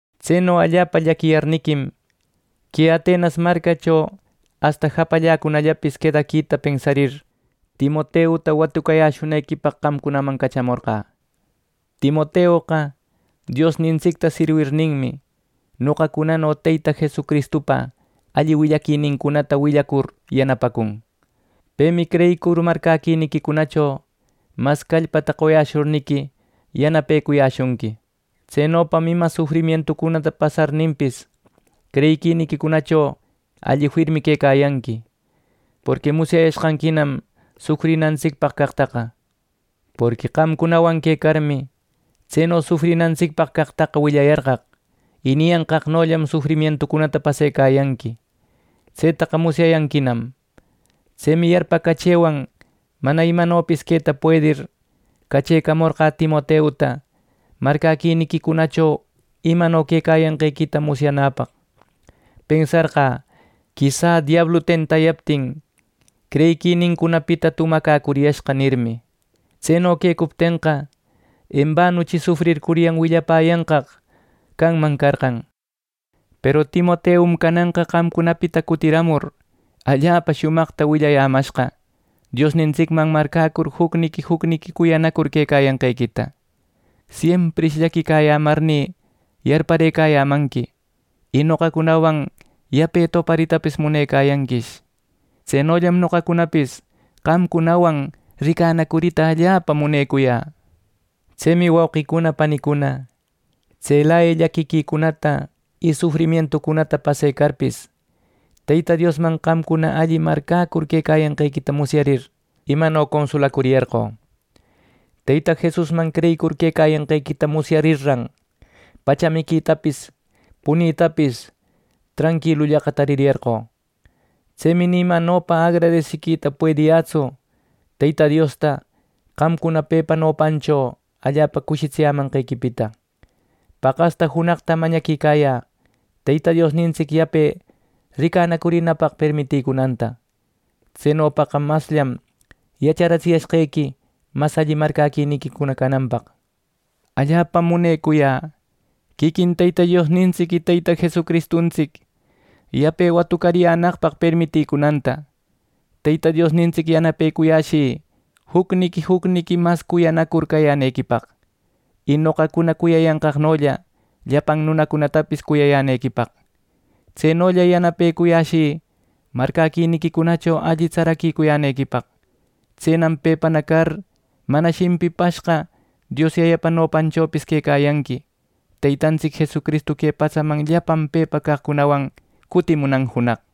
Tseno allapa llaquiyarniquim, que Atenas marcacho asta japalläcunallapis quedaquita pensarir, Timoteuta watucariyäshunequipaq qamcunaman cachamorqä. Timoteoqa Diosnintsicta sirwirninmi, noqacunano Teyta Jesucristupa alli willaquinincunata willacur yanapacun. Pemi creyicur, marcäquiniquicunacho mas callpata qoyashurniqui yanapecuyäshunqui. Tsenopam ima sufrimientucunata pasarninpis, creyiquiniquicunacho alli firmi quecayanqui, porqui musyayashqanquinam sufrinantsicpaq caqtaqa. Porqui qamcunawan quecarmi, tseno sufrinantsicpaq caqtaqa willayarqaq, y niyanqaqnollam sufrimientucunata pasecayanqui. Tsetaqa musyayanquinam. Tsemi yarpacachëwan mana imanopis queta puedir, cachecamorqä Timoteuta marcäquiniquicunacho imano quecayanqequita musyanäpaq. Pensarqä “Quisä diablu tentayaptin creyiquinincunapita tumacäcuriyashqa” nirmi. Tseno quecuptenqa, embanuchi sufrircuryan willapäyanqaq canman carqan. Peru Timoteum cananqa qamcunapita cutiramur, allapa shumaqta willayämashqa Diosnintsicman marcäcur jucniqui jucniqui cuyanacur quecayanqequita. Siemprish llaquiyämarnï yarparëcayämanqui y noqacunawan yape toparitapis munecayanquish. Tsenollam noqacunapis qamcunawan ricanacurita allapa munecuyä. Tsemi wauqicuna panicuna, tselaya llaquiquicunata y sufrimientucunata pasecarpis, Teyta Diosman qamcuna alli marcäcur quecayanqequita musyarir, imano consulacuriyarqö. Teyta Jesusman creyicur quecayanqequita musyarirran, pacha miquitapis punitapis tranquilullaqa taririyarqö. Tsemi ni imanopa agradesiquita puediyätsu Teyta Diosta qamcuna pepa nopancho allapa cushitsiyämanqequipita. Paqasta junaqtam mañaquicayä Teyta Diosnintsic yape ricanacurinapaq permitïcunanta. Tsenopaqa masllam yacharatsiyashqequi mas alli marcäquiniquicuna cananpaq. Allapam munecuyä quiquin Teyta Diosnintsic y Teyta Jesucristuntsic yape watucariyänaqpaq permitïcunanta. Teyta Diosnintsic yanapecuyäshï jucniqui jucniqui mas cuyanacur cayänequipaq, y noqacuna cuyayanqaqnolla llapan nunacunatapis cuyayänequipaq. Tsenolla yanapecuyäshï marcäquiniquicunacho alli tsaracuyänequipaq. Tsenam pepana car mana shimpipashqa Dios Yayapa nopanchopis quecayanqui Teytantsic Jesucristu que patsaman llapan pepa caqcunawan cutimunan junaq.